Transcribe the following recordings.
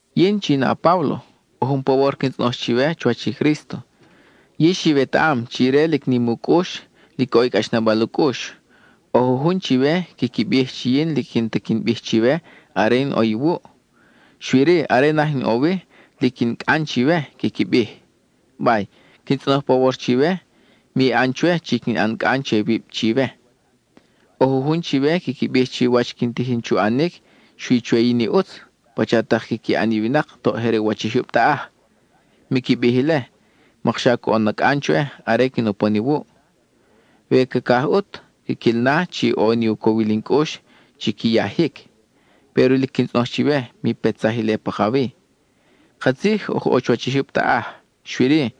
Yin, chi in a-Páblo, ʼo jun pawor quin tzʼonoj chiwe chuwach i Crísto. Yix iwetaʼam chi ire lic nim u cʼux, lic ʼo i cʼaxnabal u cʼux. ʼO jujun chiwe quiqui bij chi yin lic n-ta quin bij chiwe are in ʼo iwuʼ, xui-ri, are naj in ʼo wi, lic in cʼan chiwe, quiqui bij. Bay, quin tzʼonoj pawor chiwe, mi ʼan chwe chi quin ʼan cʼan che wib chiwe. ʼO jujun chiwe quiqui bij chi wach quin tijin chu ʼanic, xui chwe yin i ʼutz, pacha tak quiqui ʼan i winak toʼ je re u wach i jyub taʼaj. Miqui bij ile, mokxa coʼon na cʼan chwe are quin upon iwuʼ. We cacaj ʼut, quiquil na chi ʼo ni u cowil in cʼux chi qui yajic, péro lic quin tzʼonoj chiwe, mi petsaj ile pakawi. Katzij oj ʼo chuwach i jyub taʼaj, xui-ri,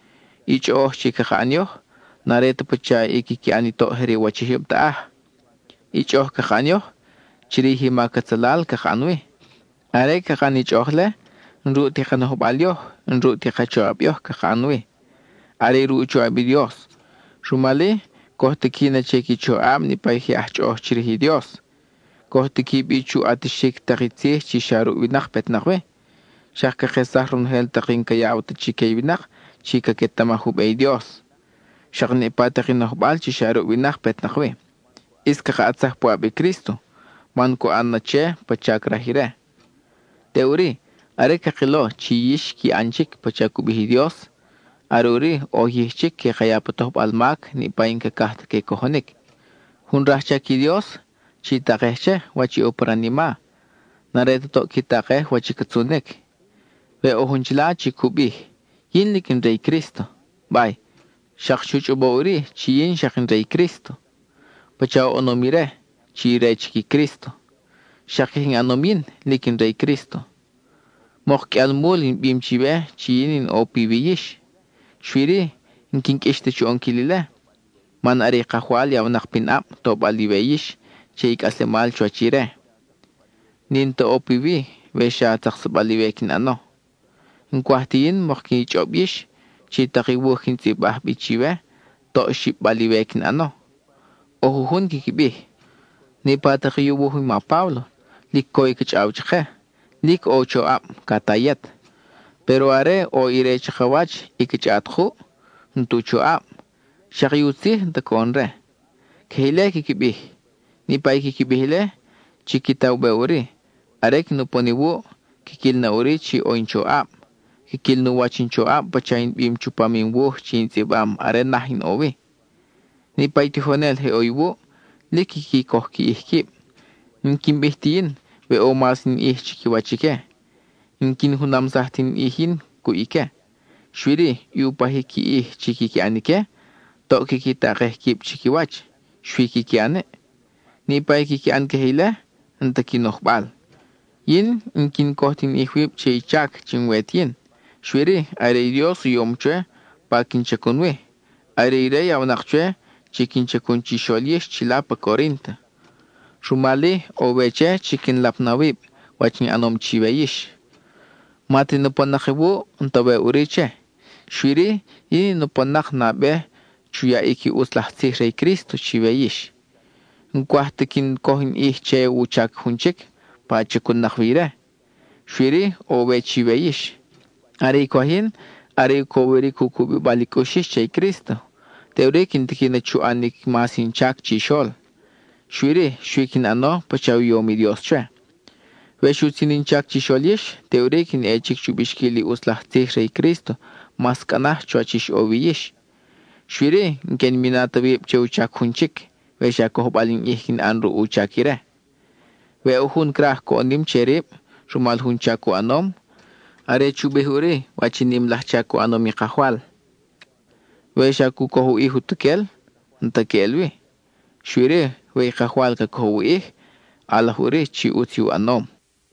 i chʼoʼoj chi caka ʼan yoj n-are ta pacha i quiqui ʼan i toʼ je re u wach i jyub taʼaj. (I chʼoʼoj caka ʼan yoj, chirij i mac atzalal caka ʼan wi.) Are caka ʼan i chʼoʼoj-le, n-ruʼ ti ka nojbal yoj, n-ruʼ ti ka choʼab yoj, caka ʼan wi; are ruʼ u choʼab i Dios, rumal-i, coj tiqui na che qui choʼab niʼpa i je aj chʼoʼoj chirij i Dios. Coj tiqui bi chu ʼatixic tak i tzij chi xa ruʼ winak petnak wi; xak cakesaj ronojel tak i n-ca yaw ta chique i winak chi caquetamaj u be i Dios. Xak niʼpa tak i nojbal chi xa ruʼ winak petnak wi, ʼis caka ʼatsaj puʼab i Crísto, man cu ʼan na che pacha craj ire. Teʼuri, are cakilo chi yix qui ʼan chic pacha i cu bij i Dios, are ʼuri oj yij chic que ka ya pa tojbal mac niʼpa i n-cacaj ta que cojonic. Jun rajchac i Dios, chi takej che, wach i ʼo pa ranima; n-are ta toʼ qui takej wach i ca tzunic. We ʼo jun chila chi cu bij: “Yin lic in re i Crísto,” bay, xak chu chʼobo ʼuri chi yin xak in re i Crísto. Pacha oʼonom ire, chi re chic i Crísto, xak queje in ʼanom yin, lic in re i Crísto. Mok qʼuialmul in bim chiwe chi yin in ʼo piwi yix; xui-ri, n-quin qʼuix ta chu ʼonquil ile, man are i Kajwal yawnak pinʼab, tobal iwe yix che i cʼaslemal chuwach ire; n-in ta ʼo piwi we xa tzaksabal iwe quin ʼano. N-cwaj ti yin mok qui chʼob yix, chi tak i wuj quin tzʼibaj bi chiwe toʼ xib-bal iwe quin ʼano. ʼO jujun quiqui bij: “Niʼpa tak i u wuj i ma Páblo, lic co i ca chʼaw chake, lic ʼo u choʼab, ca ta yet; péro are ʼo ire chakawach y ca chʼaʼat kuʼ, n-tu choʼab, xak i u tzij n-ta coʼon re.” Queje ile quiqui bij. Niʼpa i quiqui bij ile, chiqui ta u be ʼuri: are quin upon iwuʼ, quiquil na ʼuri chi ʼo in choʼab; quiquil nu wach in choʼab pacha in bim chupam in wuj chi in tzʼibam are naj in ʼo wi. Niʼpa i tijonel je ʼo iwuʼ, lic quiqui coj qui ʼij quib. N-quin bij ti yin we ʼo mas in ʼij chiquiwach ique; n-quin junamsaj ti in ʼij yin cuʼ ique. Xui-ri, i u pajic qui ʼij chi quiqui ʼan ique, toʼ quiqui takej quib chiquiwach, xui quiqui ʼan-i. Niʼpa i quiqui ʼan queje ile, n-ta qui nojbal. Yin n-quin coj ti in ʼij wib che i chac chi n-we ti yin; xui-ri, are i Dios u yom chwe pa quin chacun wi; are ire yawnak chwe chi quin chacun chixol yix chila pa Corínto. Rumal-i, ʼo we che, chi quin lap na wib wach in ʼanom chiwe yix; ma ta in upon-nak iwuʼ, n-ta we ʼuri che. Xui-ri, yin in upon-nak nabe chu yaʼic i ʼutz laj tzij re i Crísto chiwe yix. Yin n-cwaj ta quin coj in ʼij che u chac jun chic pa chacun-nak wi ire, xui-ri, ʼo we chiwe yix. Are i cwaj yin, are u cowiric u cubibal i cʼux yix che i Crísto, teʼuri quin tiqui na chu ʼanic mas in chac chixol; xui-ri, xui quin ʼano pacha u yom i Dios chwe. We xutzin in chac chixol yix, teʼuri quin ʼe chic chu bixquil i ʼutz laj tzij re i Crísto mas cʼa naj chuwach ix ʼo wi yix. Xui-ri, n-que in mina ta wib che u chac jun chic, we xa cojbal in ʼij quin ʼan ruʼ u chac ire. We ʼo jun craj coʼon nim che rib (rumal jun chac u ʼanom), are chu bij ʼuri wach i nim laj chac u ʼanom i Kajwal. We xa cu coj u ʼij utuquel, n-ta queʼel wi; xui-ri, we i Kajwal ca cojow u ʼij, ʼalaj ʼuri chi ʼutz i u ʼanom.